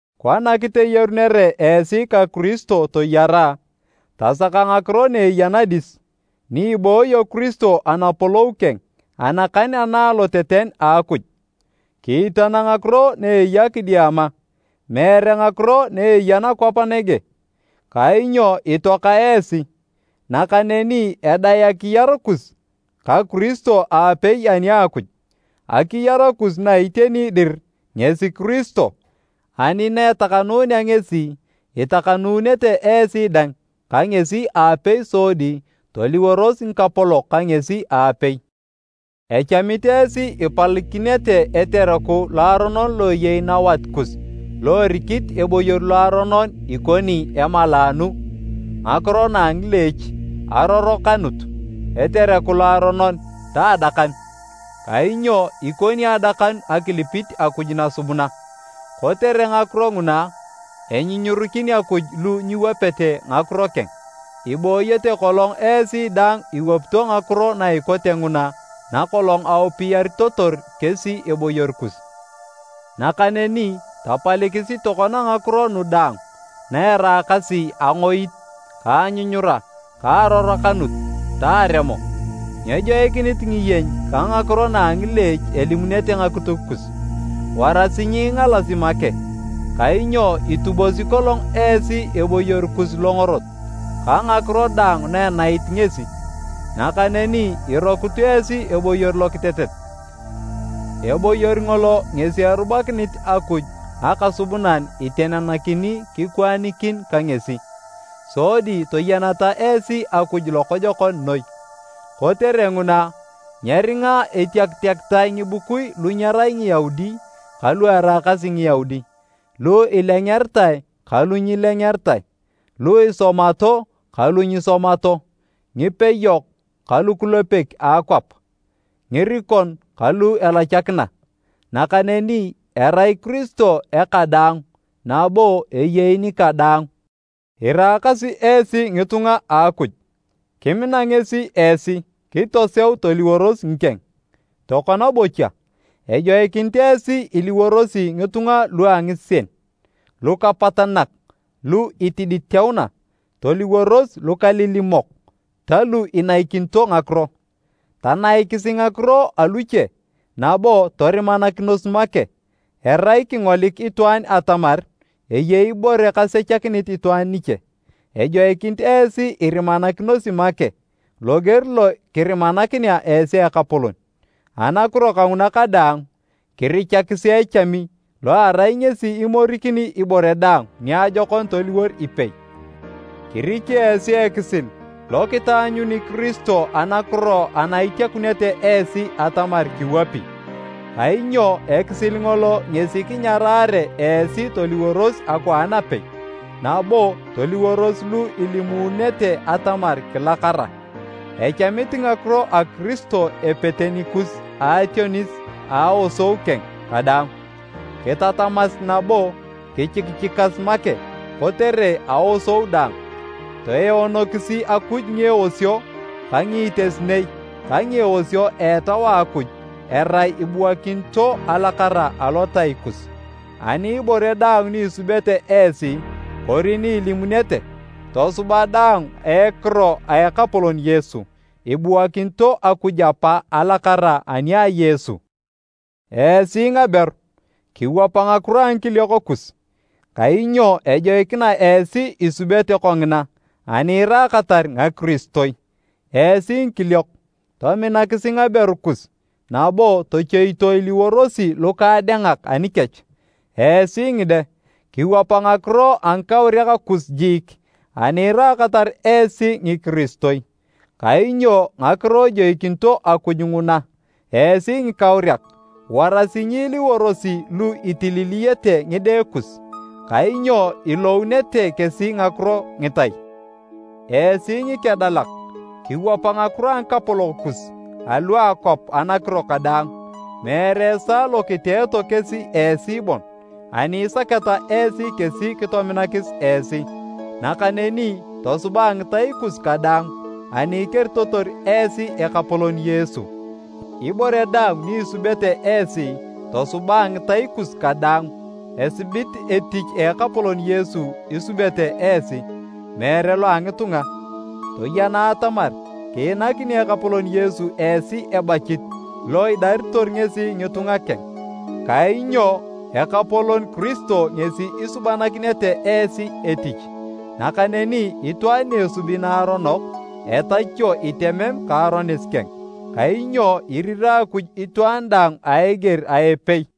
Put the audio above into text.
Kona kiteyarunere esi ka Kiristo toyara, tasaka ngakiro na eya nadis, ni ibooyo Kiristo anapolou keng, anakan ana aloteten a Akuj. Kiitana ngakiro na eya kidiama, meere ngakiro na eya nakwap nege. Kainyo itoaka esi, nakaneni edae akiyar kus ka Kiristo aapei ani a Akuj. Akiyar kus na iteni dir ngesi Kiristo, ani na etakanunea ngesi, itakanunete esi dang ka ngesi aapei sodi toliworos ngikapolok ka ngesi aapei! Echamit esi ipalikinete etereku loaronon lo eyei nawat kus lo erikit eboyor loaronon ikoni emalaanu, ngakiro na a ngileech, arorokanut, etereku loaronon ta adakanu (kainyo ikoni adakanu akilipit akuj nasubuna). Kotere ngakiro nguna enyunyurikin Akuj lu nyiwapete ngakiro keng. Ibooyete kolong esi dang iwapito ngakiro na ikote nguna nakolong aupiyaritotor kesi eboyor kus. Nakaneni tapalikisi tokona ngakiro nu daang, na eraakasi angoit, ka anyunyura, ka arorokanut ta aremo. Nyejoikinit ngiyeny ka ngakiro na a ngileech elimunete ngakituk kus. Warasi nyiingalasi make, kainyo itubosi kolong esi eboyor kus longorot ka ngakiro daang na enait ngesi nakaneni irokut esi eboyor lokitetet. Eboyor ngolo ngesi erubakinit Akuj Akasubunan itenenakini kikwaanikin ka ngesi, sodi toyeneta esi Akuj lokojokon noi. Kotere nguna, nyeringa etiakitae ngibukui lu nyerai Ngiyaudi ka lu eraakasi Ngiyaudi, lu ilengeritae ka lu nyilengeritae, lu isomato ka lu nyisomato, ngipeyok ka lukulepek a akwap, ngirikon ka lu elachakina. Nakaneni erai Kiristo eka daang nabo eyei nika daang. Iraakasi esi ngitunga a Akuj, kimina ngesi esi kitoseu toliworos ngikeng. Tokona bocha, ejoikinit esi iliworosi ngitunga lu a ngisien, lukapatanak lu itiditeuna, toliworos lukalilimok ta lu inaikinito ngakiro. Tanaikisi ngakiro aluche nabo torimanakinos make erai kingolik itwaan atamar eyei ibore kasechakinit itwaan niche. Ejoikinit esi irimanakinosi make loger lo kirimakinea esi Ekapolon. Anakiro kanguna kadaang, kirichakisi echami lo erai ngesi imorikini ibore daang niajokon toliwor ipei. Kiriki esi ekisil lo kitaanyuni Kiristo anakiro ana itiakunete esi atamar kiwapi, kainyo ekisil ngolo ngesi kinyarare esi toliworos akwaan apei. Nabo toliworos lu ilimununete atamar kilakara. Echamit ngakiro a Kiristo epete nikus a ationis a aosou keng kadaang, kitatamas nabo kichikichikas make kotere aosou daang. Toeonokisi Akuj ngieosio ka ngiitesinei ka ngieosio a Etau a Akuj erai ibuakinito alakara alotai kus. Ani ibore daang ni isubete esi kori ni ilimunete, tosuba daang a ekiro a Ekapolon Yesu, ibuakinito Akuj Apa alakara ani a Yesu. Esi ngaberu, kiwapa ngakiro a ngikiliok kus, kainyo ejoikina esi isubete kongina ani iraakatar ngakiristoi. Esi ngikiliok, tominakisi ngaberu kus nabo tochoito iliworosi lukaadengak anikech. Esi ngide, kiwapa ngakiro a ngikauriak kus jiik ani iraakatar esi ngikiristoi, kainyo ngakiro ejoikinito Akuj nguna. Esi ngikauriak, warasi nyiiliworosi lu itililiyete ngide kus, kainyo ilounete kesi ngakiro ngitai. Esi ngikedalak, kiwapa ngakiro a ngikapolok kus alu a akwap anakiro kadaang, meere esaa lo kiteeto kesi esi bon ani isaketa esi kesi kitominakis esi, nakaneni tosuba a ngitai kus kadaang ani ikeritotor esi Ekapolon Yesu. Ibore daang ni isubete esi, tosuba a ngitai kus kadaang, esibit etich a Ekapolon Yesu isubete esi, meere lo a ngitunga. Toyena atamar kiinakini Ekapolon Yesu esi ebachit lo idaritor ngesi ngitunga keng, kainyo Ekapolon Kiristo ngesi isubanakinete esi etich. Nakaneni itwaan ni esubi naaronok, etachio itemem ka aronis keng, kainyo irirae Akuj itwaan daang a eger a epei.